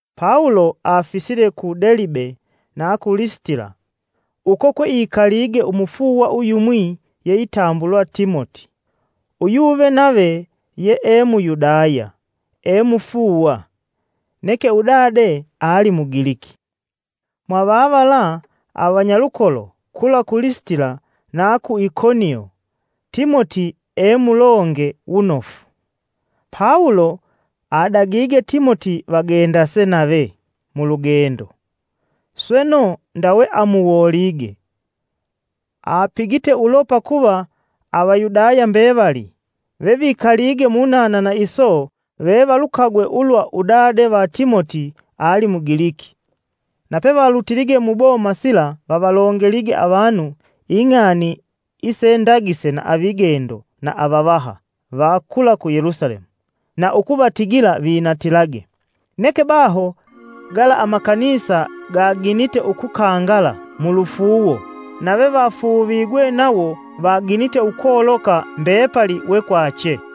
Pawulo afisile ku Delibe na ku Lisitila, uko kweikalige umufuuwa uyumwi yeitambulwa Timoti. Uyuve nave ye ee Muyudaya ee mufuuwa; neke udade ali Mugiliki. Mwa vavala avanyalukolo kula ku Lisitila na ku Ikonio Timoti ee mulonge wunofu. Pawulo adagige Timoti vagendase nave mulugendo, sweno ndawe amuwolige. Apigite ulo pakuva Avayudaya mbevali vevikalige munanana iso vevalukagwe ulwa udade va Timoti ali Mugiliki. Na pevalutilige muboma sila vavalongelige avanu ing'ani isendagise na avigendo na avavaha va kula ku Yelusalemu, na ukuvatigila vinatilage. Neke baho, gala amakanisa gaginite ukukangala mulufuuwo, na vevafuuvigwe nawo vaginite ukoloka mbepali wekwache.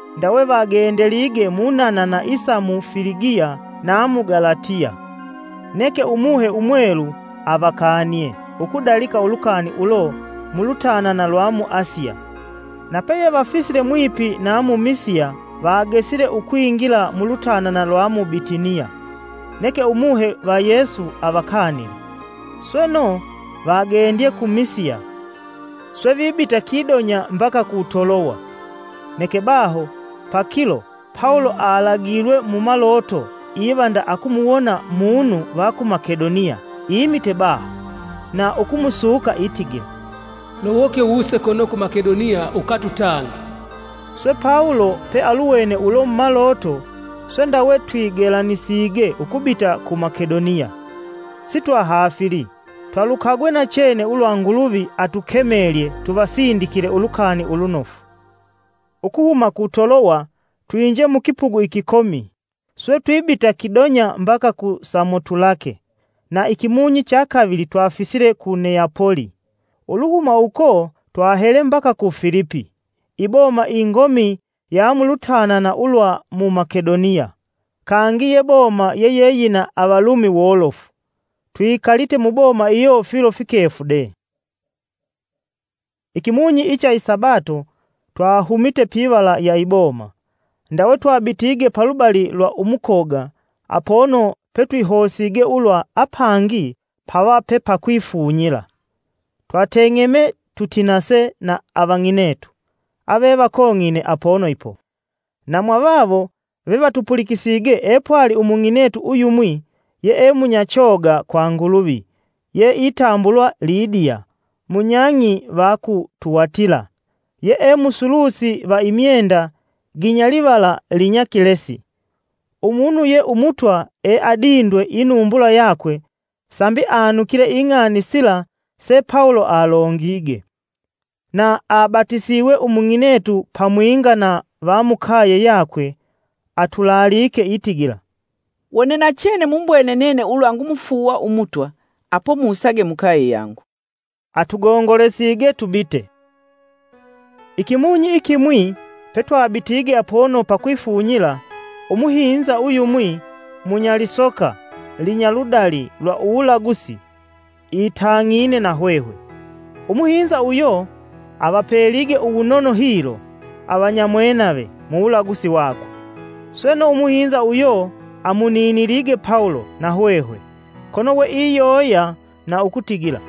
Ndawe vagendelige munanana isa mu Filigiya na mu Galatiya, neke Umuhe Umwelu avakanie ukudalika ulukani ulo mulutanana lwa mu Asiya. Na peyevafisile mwipi na mu Misiya vagesile ukwingila mulutanana lwa mu Bitiniya; neke Umuhe va Yesu avakanile. Sweno, vagendye ku Misiya, swe vibita kidonya mbaka ku Toloya. Neke baho pakilo Pawulo alagilwe mumaloto iva nda akumuwona munu va ku Makedoniya imite baho na ukumusuka itigila, “Lowoke wuse kono ku Makedoniya ukatutange.” Swe Pawulo pealuwene ulo mumaloto, swe ndawe twigelanisige ukubita ku Makedoniya sitwahafili, twalukagwe nachene ulwa Nguluvi atukemelye tuvasindikile ulukani ulunofu. Ukuhuma ku Toloya, twinje mukipugu ikikomi, swe twibita kidonya mbaka ku Samotulake, na ikimunyi chakavili twafisile ku Neyapoli. Uluhuma uko, twahele mbaka ku Filipi, iboma ingomi ya mulutanana ulwa mu Makedoniya, kangi ye boma yeyeyina Avalumi wolofu. Twikalite muboma iyo filo fikefu de. Ikimunyi icha isabato twahumite pivala ya iboma, ndawe twabitige palubali lwa umukoga apono petwihosige ulwa apangi pava pepakwifunyila. Twateng'eme, tutinase na avang'inetu avevakong'ine apono ipo. Na mwavawo vevatupulikisige epwali umung'inetu uyumwi, yeemunyachoga kwa Nguluvi yeitambulwa Lidiya munyang'i va ku Tiyatila, yee musulusi va imyenda ginyalivala linyakilesi. Umunu ye Umutwa eadindwe inumbula yakwe sambi anukile Ing'ani sila se Pawulo alongige. Na abatisiwe umung'inetu pamwinga na vamukaye yakwe atulaalike itigila, “Wone nachene mumbwene nene ulwa ngumufuuwa umutwa swe akutukemela mukaye yakwe,” atugongolesige tubite. Ikimunyi ikimwi, petwabitige apono pakwifunyila, umuhinza uyumwi munyalisoka linya ludali lwa uwulagusi itang'ine na hwehwe. Umuhinza uyo avapelige uwunono hilo, avanyamwenave muwulagusi wakwe. Sweno, umuhinza uyo amuninilige Pawulo na hwehwe, kono we iyoya na ukutigila,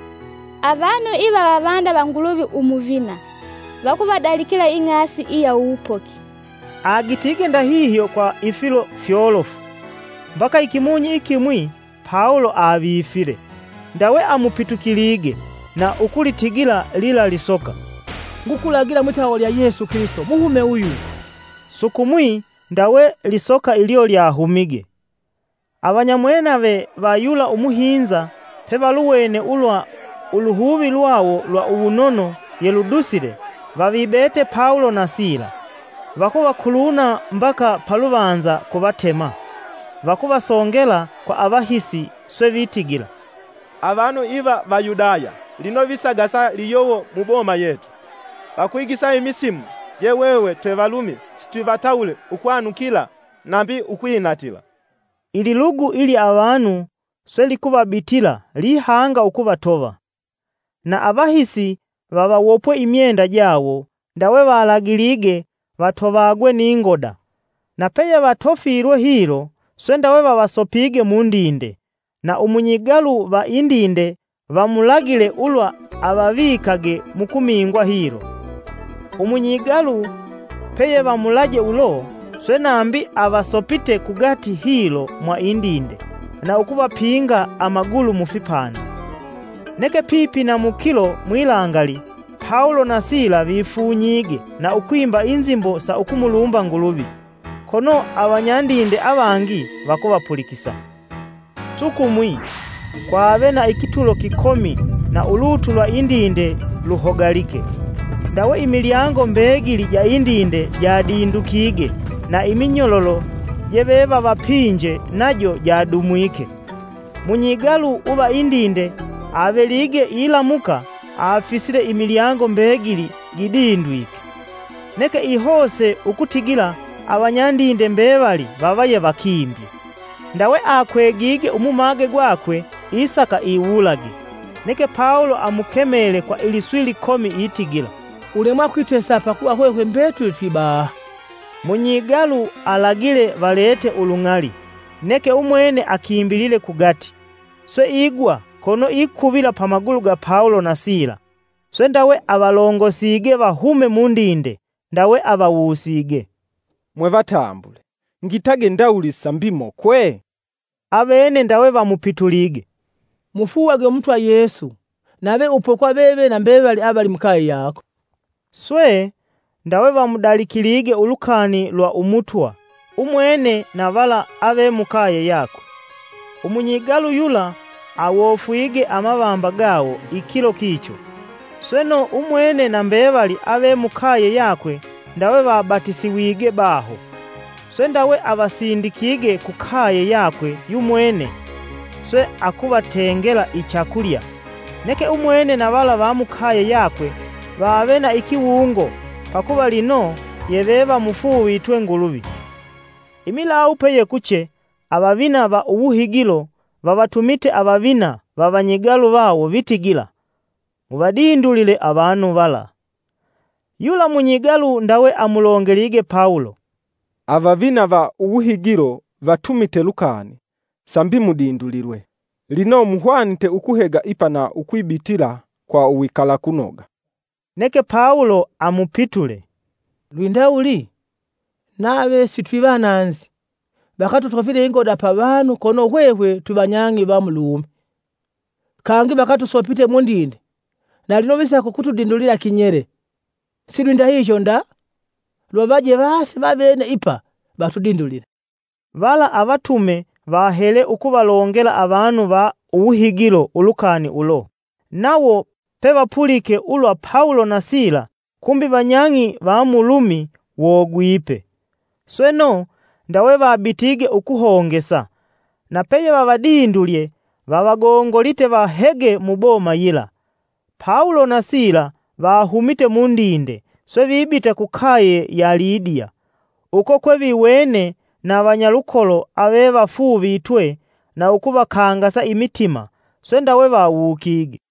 “Avanu iva vavanda va Nguluvi umuvina. Vakuvadalikila ing'asi iya uwupoki.” Agitige ndahihyo kwa ifilo fyolofu mbaka ikimunyi ikimwi Pawulo avifile, ndawe amupitukilige na ukulitigila lila lisoka, “Ngukulagila mwitawa lya Yesu Kilisito, muhume uyu!” Sukumwi ndawe lisoka ilyo lyahumige. Avanyamwenave va yula umuhinza pevaluwene ulwa uluhuvi lwawo lwa uwunono yeludusile vavibete Pawulo na Sila, vakuvakuluna mbaka paluvanza, kuvatema. Vakuvasongela kwa avahisi swe vitigila, “Avanu iva Vayudaya lino visagasa liyowo muboma yetu. Vakwigisa imisimu je hwehwe twe Valumi sitwivatawule ukwanukila nambi ukwinatila.” Ililugu ilya avanu swe likuvabitila lihanga ukuvatova, na avahisi vavawopwe imyenda jawo ndawe valagilige vatovagwe ni ngoda. Na peyevatofilwe hilo, swe ndawe vavasopige mundinde, na umunyigalu va indinde vamulagile ulwa avavikage mukumingwa hilo. Umunyigalu peyevamulaje ulo, swe nambi avasopite kugati hilo mwa indinde na ukuvapinga amagulu mufipanda. Neke pipi na mukilo mwilangali Pawulo na Sila vafunyige na ukwimba inzimbo sa ukumulumba Nguluvi, kono avanyandinde avangi vakuvapulikisa. Sukumwi, kwave na ikitulo kikomi na ulutu lwa indinde luhogalike. Ndawe imilyango mbegili ja indinde jadindukige na iminyololo jevevavapinje najo jadumwike. Munyigalu uva indinde avelige ilamuka afisile imilyango mbegili gidindwike, neke ihose ukutigila avanyandinde mbevali vava yevakimbye; ndawe akwegige umumage gwakwe, isaka iwulage. Neke Pawulo amukemele kwa iliswi likomi itigila, “Ulemwa kwitesa pakuva hwehwe mbetuli twibaha.” Munyigalu alagile valete ulung'ali, Neke umwene akimbilile kugati, swe igwa kono ikuvila pa magulu ga Pawulo na Sila. Swe ndawe avalongosige vahume mundinde, ndawe avawusige, “Mwevatambule ngitage ndawuli sambi mokwe?” Avene ndawe vamupitulige, “Mufuuwage Umutwa Yesu nave upokwa veve na mbevali avali mukaye yako.” Swe, ndawe vamudalikilige ulukani lwa Umutwa umwene vala ave mukaye yakwe. Umunyigalu yula, awofuge amavamba gawo ikilo kicho, sweno umwene na mbevali ave mukaye yakwe ndawe vabatisiwige baho. Swe ndawe avasindikige kukaye yakwe yu mwene, swe akuvatengela ichakulya. Neke umwene na vala va mukaye yakwe vave na ikiwungo, pakuva lino yeve vamufuuvitwe Nguluvi. Imilawu peyekuche, avavina va uwuhigilo vavatumite avavina va vanyigalu vawo vitigila, “Muvadindulile avanu vala.” Yula munyigalu ndawe amulongelige Pawulo: “Avavina va uwuhigilo vatumite lukani sambi mudindulilwe. Lino muhwanite ukuhega ipa na ukwibitila kwa uwikalakunoga.” Neke Pawulo amupitule, “Lwindawuli? Nave sitwivananzi, vakatutofile ingoda pavanu kono hwehwe twivanyang'i va mu Lumi. Kangi, vakatusopite mundinde na lino visaka vatudindulile kinyele! Silwindahihyo nda! Luvavaje vase vavene ipa vatudindulile.” Vala avatume vahele ukuvalongela avanu va uwuhigilo ulukani ulo, nawo pevapulike ulwa Pawulo na Sila kumbi vanyang'i va mu Lumi, wogwipe. Sweno, ndawe vabitige ukuhongesa na peyevavadindulye vavagongolite vahege muboma yila. Pawulo na Sila vahumite mundinde, swe vibita kukaye ya Lidiya. Uko kweviwene na vanyalukolo avevafuuvitwe na ukuvakangasa imitima swe ndawe vawukige.